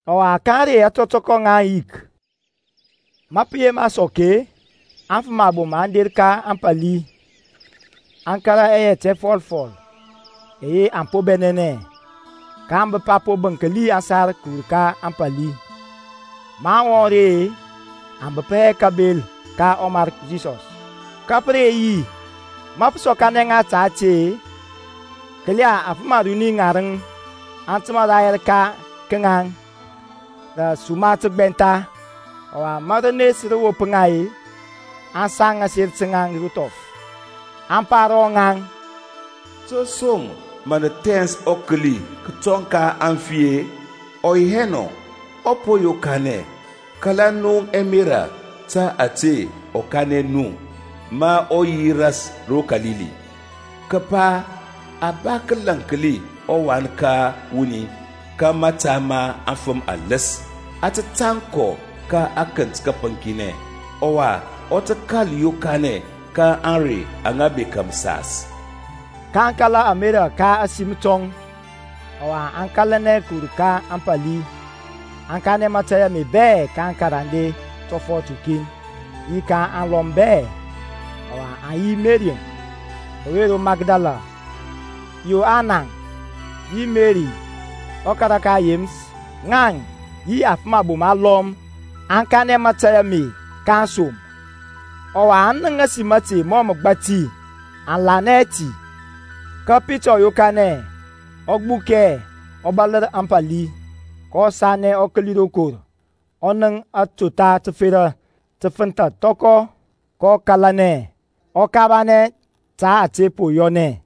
Ɔwa ka ȧŋrey ȧtɔtɔkɔ ŋa ȧŋyik, ma pə yema sɔk-e, aŋfəm abom aŋ der ka ȧŋpȧli, aŋ kȧrȧ ɛyɛt ɛfɔlfɔl ɛyɛ aŋ po bɛnɛnɛ. kaŋ bəp a po bənkli aŋsar kəwur ka ȧŋpȧli. Maŋ wɔŋ ri-e, aŋ bəp hɛ kabel ka ɔMarki Yisɔs. Ka pə re yi-e, ma pə sɔkanɛ ŋa ta ti-e, kəla afəm aruni ŋarəŋ aŋ təmȧ rayɛr ka ŋaŋ rə suma təgbɛntha. Ɔwa ma rənes rə wop ŋa-e aŋ saŋ aser taŋ ro thɔf, aŋ pa ro ŋaŋ, To som mə nə thɛns ɔkəli kətɔŋ ka aŋfi-e? Ɔ yi hɛ nɔ, ɔ po yokanɛ. Kala nu ɛmerȧ ta ȧte ɔ kanɛ nu ma ɔ yi ras ro Kalili, kəpa a ba kəlaŋkli ɔWan ka wuni ka mȧta ma aŋfəm aləs, a tə tȧŋ kɔ ka akənt kəpəŋkinɛ, ɔwa ɔ tə kȧl yokanɛ ka ȧŋrey aŋa bekȧ məsas. kaŋ kala ɛmerȧ ka ȧsim tɔŋ, ɔwa aŋ kȧlanɛ kəwur ka ȧŋpȧli, aŋ kanɛ mȧtȧy ame bɛ ka aŋkarande tɔfɔt ukin yi ka aŋlɔm bɛ. Ɔwa aŋ yi Meri ɔwe ro Makdala, Yoana, yi Meri ɔkara ka Yeməs; ŋaŋ yi aŋfəm abom alɔm aŋ kanɛ mȧtȧy ame ka aŋsom. Ɔwa aŋ nənk ȧsim ȧte mɔ məgbati; aŋ lanɛ hɛ ti. Ka Pita ɔ yokanɛ, ɔ gbukɛ, ɔ bȧlər ȧŋpȧli. Kɔ sanɛ ɔ kəli rokor, ɔ nənk atotha təfera tə fənthȧ thɔkɔ, kɔ kȧlanɛ, ɔ kabanɛ ta ȧte po yɔnɛ.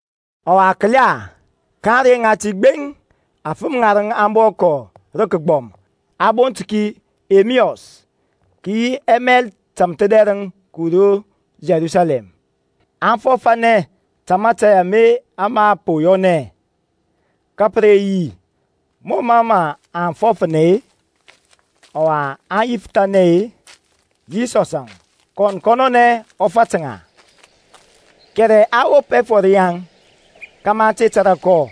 Ɔwa kəla, ka ȧŋrey ŋati gbeŋ afəm ŋarəŋ aŋ bɔ kɔ rə kəgbɔm a bont ki Emeus, kə yi ɛmail tȧmthədɛrəŋ kəwur ro Yerusalɛm. Aŋ fɔfȧnɛ ta mȧtȧy ame ama po yɔnɛ. Ka pə re yi, mɔ mə aŋ fɔfȧnɛ-e, ɔwa aŋ yifəthanɛ-e, Yisɔsȧŋ, kɔn kɔnɔnɛ ɔ fat ŋa. Kɛrɛ a wop ɛfɔr yaŋ kȧmȧ aŋ te tȧrȧ kɔ.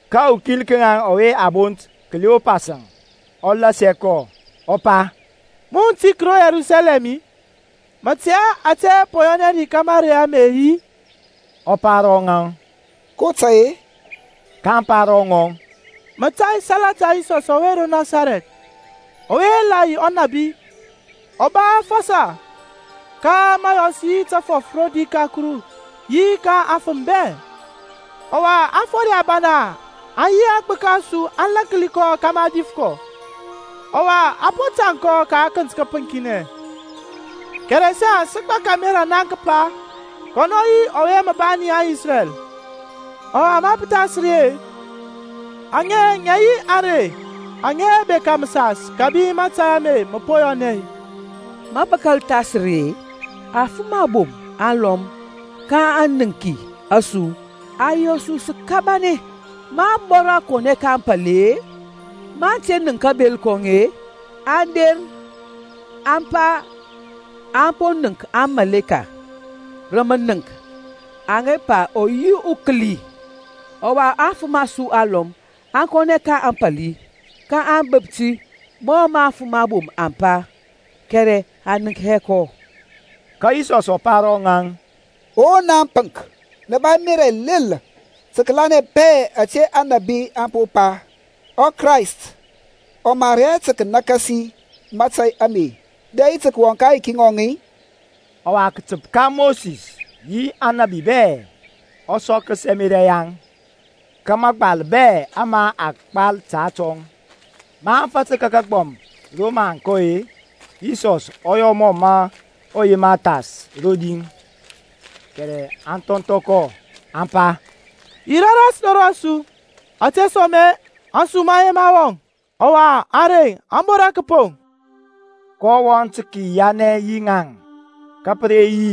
Ka ukin ka ŋaŋ ɔwe a bont Kleopasȧŋ, ɔ lasia kɔ, ɔ pa, Mun utik ro Yerusalɛm-i? Mə tɛ hɛ ȧte po yɔnɛ ri ka mȧrey ame-i? Ɔ pa ro ŋaŋ, Ko tai-e? kaŋ pa ro ŋɔŋ, Mȧtȧy salata Yisɔs ɔwe ro Nasarɛth, ɔwe la yi unabi uba afɔsɔ ka məyɔs yi təfɔf rodi ka Kuru yi ka aŋfəm bɛ: Ɔwa aŋfode abana yi aŋgbəka a su aŋ lȧnki kɔ kȧmȧ a dif kɔ, ɔwa a po tȧŋ kɔ ka akənt kəpəŋkinɛ. Kɛrɛ saŋ sə gbak ȧmerȧ naŋ kəpa kɔnɔ yi ɔwe mə bani Isrɛl, ɔwa ma pə thas ri-e, aŋe ŋə yi ȧŋrey aŋa bekȧ məsas kȧbi ma mȧtȧy ame mə po yɔnɛ. Ma pə kȧl thas ri-e, afəm abom alɔm ka aŋniŋki a su aŋ yɔ su sə kabanɛ. Maŋ bɔra kɔnɛ ka ȧŋpȧli-e, maŋ te nənk kabel kɔŋ-e, aŋ der, aŋ pa aŋ po nənk amaleka rə mənəŋk aŋa pa ɔ yi ukəli. Ɔwa aŋfəm a su alɔm aŋ kɔnɛ ka ȧŋpȧli, kaŋ bəp ti mɔ mə aŋfəm abom aŋ pa, kɛrɛ aŋ nənk hɛ kɔ. Ka Yisɔs ɔ pa ro rɔŋaŋ, O naŋ apənk, nə ba ɛmerȧ ɛlel tə kəlanɛ bɛ ȧte aŋnabi aŋ po pa. ƆKrayst ɔ mar hɛ tə kənakasi mȧtȧy ame dɛ yi tə kəwɔŋ ka aŋyiki ŋɔŋ-i? Ɔwa, kətəp ka Mosis yi aŋnabi bɛ, ɔ sɔkəs ɛmerȧ yaŋ ka mȧgbal bɛ ama a gbal ta atɔŋ. Maŋ fatər ka aŋgbɔm ro mə aŋ kɔ-e, Yisɔs ɔ yɔ mɔ ɔ yema thas rodi kɛrɛ aŋ thɔnthɔ kɔ, aŋ pa, Yirȧ ras ro rɔsu, ȧtesoma-e ȧŋsum aŋ yema wɔŋ, ɔwa ȧŋrey aŋ bora kəpoŋ. Kɔ wɔŋ tə kəyianɛ yi ŋaŋ. Ka pə re yi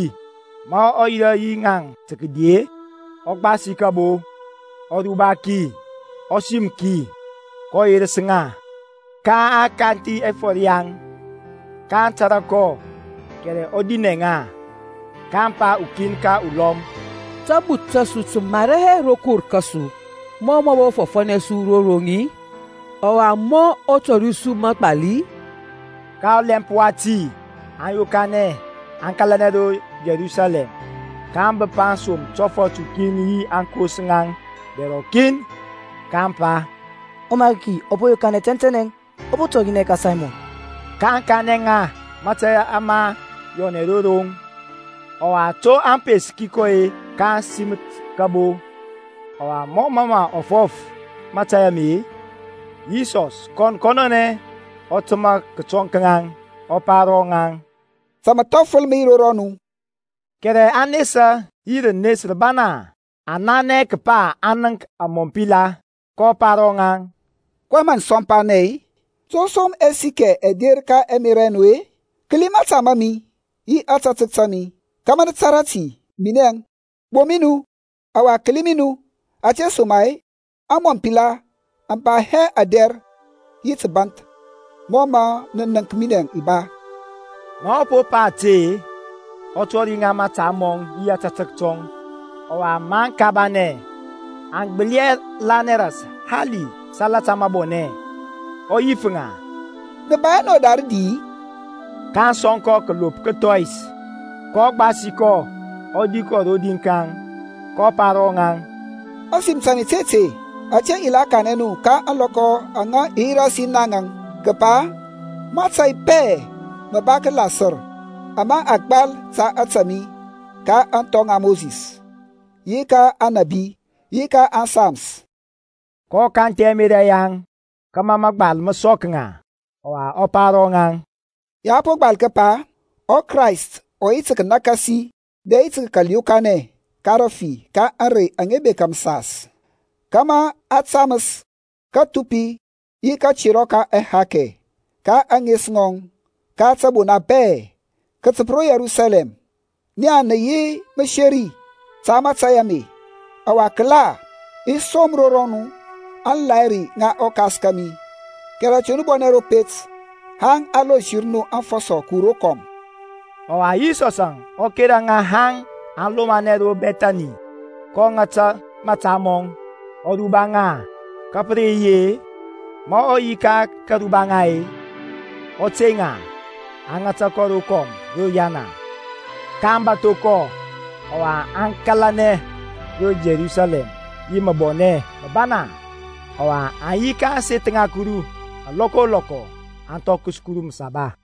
ma ɔ yirȧ yi ŋaŋ tə kədi-e, ɔ gbasi kəbo, ɔ ruba ki, ɔ sim ki, kɔ yerəs ŋa. Ka a kanthi ɛfɔr yaŋ, kaŋ tȧrȧ kɔ; kɛrɛ ɔ dinɛ ŋa. kaŋ pa ukin ka ɔlɔm, Tabuth ta su tə mara hɛ rokor kȧsu ma ɔ bɔ fɔfȧnɛ su ro roŋ-i, ɔwa ma ɔ tɔri su mȧgbal-i? Ka ɔlɛmp wati aŋ yokanɛ aŋ kȧlanɛ ro Yerusalɛm, kaŋ bəp aŋsom tɔfɔt ukin yi aŋkos ŋaŋ dɛr rɔkin, kaŋ pa, ƆMariki ɔ po yokanɛ tɛntɛnɛ, ɔ po tɔrinɛ ka Saymɔn. kaŋ kanɛ ŋa mȧtȧy ama yɔnɛ ro roŋ, ɔwa to aŋ peski kɔ-e ka kasiməth kabo. Ɔwa mɔ mə aŋ fɔf mȧtȧy ame-e, Yisɔsȧŋ kɔn kɔnɔnɛ ɔ təmȧ kətɔŋ ka ŋaŋ, kɔ pa ro rɔŋaŋ, Ta məthɔfəl mə yi ro rɔnu. Kɛrɛ aŋ nesa yi rənes rəbana, aŋ nanɛ kəpa aŋ nənk amɔmpila. kɔ pa ro ŋaŋ, kɔyɛŋ mə nə sɔmpanɛ-e? To som ɛsikɛ ɛ der ka ɛmerȧ ɛ nu-e? Kəli mȧta ma mi yi ȧtȧtək ta mi kȧmȧ mə tȧrȧ ti minɛŋ! Gboŋ mi nu, ɔwa kəli mi nu, ȧtesoma-e amɔmpila aŋ ba hɛ adɛr yi təbȧnth mɔ mə nə nənk minɛ i ba. Ma ɔ po pa ȧte-e, ɔ tori ŋa mȧta mɔŋ yi ȧtȧtək tɔŋ. Ɔwa maŋ kabanɛ, aŋ gbəli hɛ lanɛ ras hali təsalata mȧbɔnɛ, ɔ yif ŋa, Nə ba hɛ nɔ da rədi-i? kaŋ sɔŋ kɔ kəlop kəthɔyis. kɔ gbasi kɔ ɔ di kɔ rodi ka ŋaŋ. kɔ pa ro rɔŋaŋ, Ȧsim ta mi ti ȧte, ȧte i la kanɛ nu ka ȧŋlɔkɔ aŋa i yi ras yi naŋȧŋ kəpa mȧtȧy bɛ mə ba tə kəlasər ama a gbal ta ȧtȧ mi ka aŋthɔ ŋa Mosis, yi ka aŋnabi, yi ka ȧŋSams. kɔ kanthi ɛmerȧ yaŋ kȧmȧ mȧgbal mə sɔk ŋa. Ɔwa ɔ pa ro ŋaŋ, Ya a po gbal kəpa ɔKrayst ɔ yi tə kənakasi dɛ yi tə kəkal yokanɛ ka rəfi ka ȧŋrey aŋa bekȧ məsas, kȧmȧ a taməs kathupi yi katerɔ ka ɛhakɛ ka ȧŋes ŋɔŋ ka tȧbona bɛ, kətəp ro Yerusalɛm. Naŋ nə yi məseri ta mȧtȧy ame. Ɔwa kəla, i som ro rɔnu aŋlahiri ŋa ɔKas kȧmi, kɛrɛ te nu bɔnɛ ro pet haŋ a lonsər nu afɔsɔ kəwur rokɔm. Ɔwa Yisɔsȧŋ ɔ kera ŋa haŋ aŋ lomanɛ ro Bɛthani, kɔ ŋata mȧta mɔŋ, ɔ ruba ŋa. Ka pə re yi-e, ma ɔ yi ka karuba ŋa-e, ɔ tey ŋa, a ŋata kɔ rokɔm ro riyana. kaŋ bȧtho kɔ, ɔwa aŋ kȧlanɛ ro Yerusalɛm yi məbɔnɛ məbana. Ɔwa aŋ yi ka ȧŋseth ŋa Kuru alɔkɔ o lɔkɔ, aŋ thɔkəs Kuru Məsaba.